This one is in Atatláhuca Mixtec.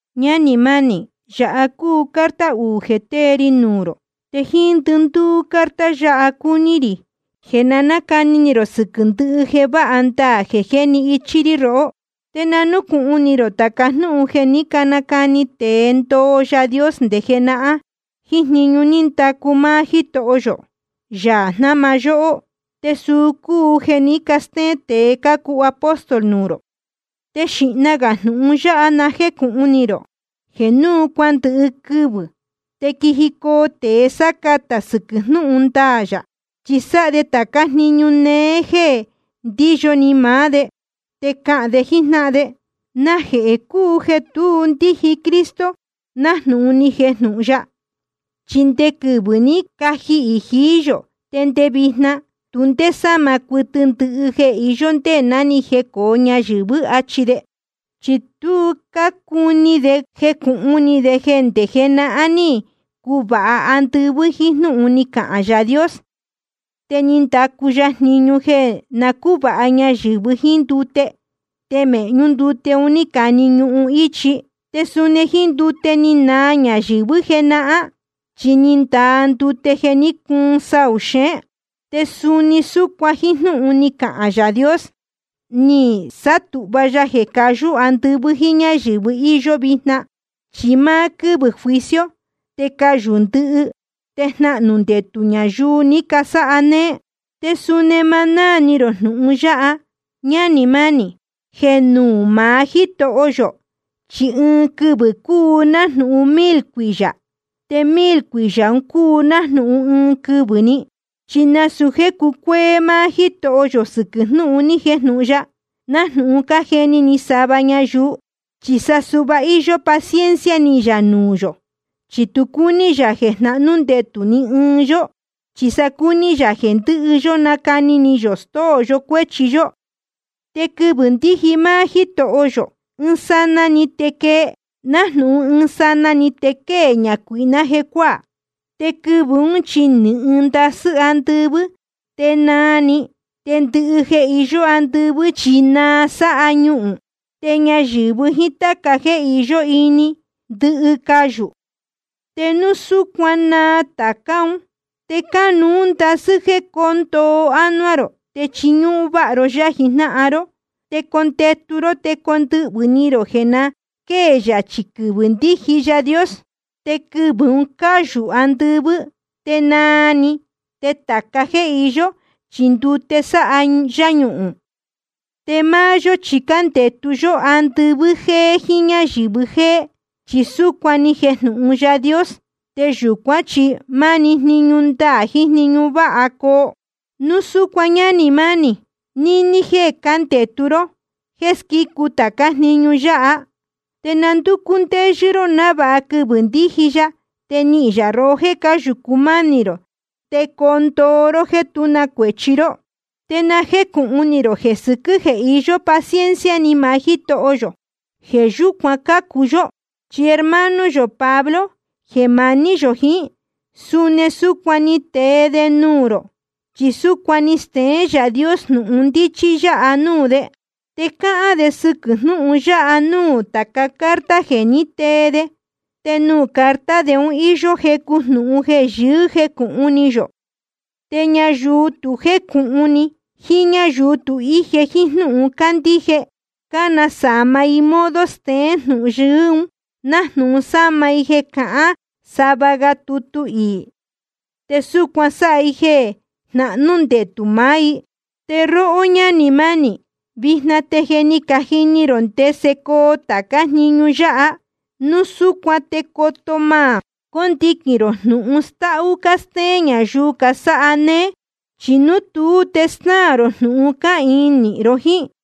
Ñánī mánī, yāha cúu carta uū jeē tée ri nuū rō. Te jíín ndɨndúú carta yáha cúní rī jeē nacani ni rō sɨquɨ̄ ndɨhɨ jeē váha ndaā jeē jéni ichí rí rohó. Te na núcūhun ni rō tāca jnúhun jeē ní canacani tēe ndoo Yaā Dios nde jenahán, jíín jniñu ní ndacu máá Jítoho yō, Yaā jnáma yóhó. Te suu cúu jeē ní castéén tēe cácuu apóstol nuū rō. Te xīhna gā jnūhun yáha na jécūhun ni rō: Jeē nuū cuándɨhɨ quɨvɨ̄ te quijicoo tēe sácatā sɨquɨ̄ jnúhun ndaā yā, chi sáha de tācá jniñu néé jéē ndíyo ni maá de. Te cahān de jíjnáhan de: ¿Najehē cúu jeē tu ndíji Cristo nájnūhun ni jejnūhun ya? Chi nde quɨvɨ̄ ní cajihī jií yō te nde vijna, tu ndé sáma cuɨtɨ ndɨhɨ jeē iyó ndé ná ni jecōo ñayɨ̄vɨ́, achi de. Chi tu cácuni de jecūhun ni de jeē ndé jenahán ní cuvāha andɨvɨ́ jíín jnúhun ni cahān Yaā Dios. Te ni ndacu ya jniñu jeē na cúvāha ñayɨ̄vɨ jíín ndute, te mēhñú ndute ni nane ñuhun íchi. Te suni jíín ndute ni naa ñayɨ̄vɨ́ jenahán, chi ni ndaa ndute jeē ní cuun saū xeén. Te suni súcuan jíín jnúhun ni cahān Yaā Dios ni sátūhva ya jeē cayú andɨvɨ́ jíín ñáyɨ̄vɨ íyó vijna. Chi máá quɨ́vɨ̄ juicio te cayū ndɨhɨ, te jnahnū ndetū ñayuu ni casáha néé. Te suni ma náā ni rō jnūhun yáha, ñánī mánī: Jeē nuū maá Jítoho yō chi ɨɨn quɨvɨ̄ cúu nájnūhun mil cuiyā, te mil cuiyā cúu nájnūhun ɨɨn quɨvɨ̄‑ni. Chi nasūu jéē cucuéé máá Jítoho yō sɨquɨ̄ jnúhun ni jejnūhun ya, nájnūhun cájeni ni sava ñayuu. Chi sa suhva íyó paciencia ni yā nuū yō, chi tu cúní yā jeē jnahnú ndetū ni ɨɨn yó, chi sa cúní yā jeē ndɨhɨ yó nacani ni yō stóo yó cuéchi yó. Te quɨvɨ̄ ndíji máá Jítoho yō, ɨɨn sanaa‑ni te quee, nájnūhun ɨɨn sanaa‑ni te quée ñacuīhná jecuáā. Te quɨvɨ̄ ún chi nɨ̄hɨn ndasɨ́ andɨvɨ́, te naa‑ni. Te ndɨhɨ jeē iyó andɨvɨ́ chi naa sáha ñuhūn. Te ñayɨ̄vɨ jíín táca jéē iyó ini, ndɨhɨ cayū. Te núu súcuan naa tācá un, te cánuú ndasɨ́ jéē coo ndoo ánuá rō te chiñúhún váha ro yá jijnáhan ró. Te condetu ró te condɨhvɨ̄ ni rō jeē na quée yachī quɨvɨ̄ ndíji Yaā Dios. Te quɨvɨ̄ ún cayū andɨvɨ́ te naa‑ni, te tāca jéē iyó chi ndute sáha yáñuhūn. Te máá yó chi cándetu yó andɨvɨ́ jéé jíín ñáyɨ̄vɨ jéé, chi súcuan ni jejnūhun Yaā Dios. Te yūcuán chi máni jniñu ndaā jiín jniñu váha coo. Núu súcuan, ñánī mánī, níní jéē cándetu ró jéē squícu tācá jniñu yáha, te na ndúcú ndéyɨ́ ró návāha quɨvɨ̄ ndíji ya te nihīn yā rohó jéē cáyūcu mánī rō, te coo ndoo ró jéē tú na cuēchi ró. Te na jécūhun ni rō jeē sɨquɨ̄ jeē iyó paciencia ni maá Jítoho yō, jeē yúcuan cácu yó. Chi hermano yō Pablo jeē maní yō jiín, suni súcuan ni tee de nuū rō, chi súcuan ni steén Yaā Dios jnūhun ndíchí yá nuū de. Te cáhán de sɨquɨ̄ jnúhun yáha núū tāca carta jeē ní tee de. Te nuū carta de un íyó jecu jnūhun jeē yɨɨ́ jécūhun ni yō. Te ñayuu tu jécūhun ni jiín ñáyuu tu íje jíín jnúhun cándíje, cánasama i modo steén jnūhun yɨɨ́ un, nájnūhun násama i jeē cahán sava ga tutu iī. Te súcuan sáha i jeē jnahnú ndetū maá i. Te róhó ñánī mánī, vijna te je ni cajini rō ndese coo tācá jniñu yáha. Núu súcuan te coto má condiquīn rō jnūhun stáhú cástéén ñayuu casáha néé. Chi núu tuú te snáā rō jnūhun cáhīin nīhin ró jíín.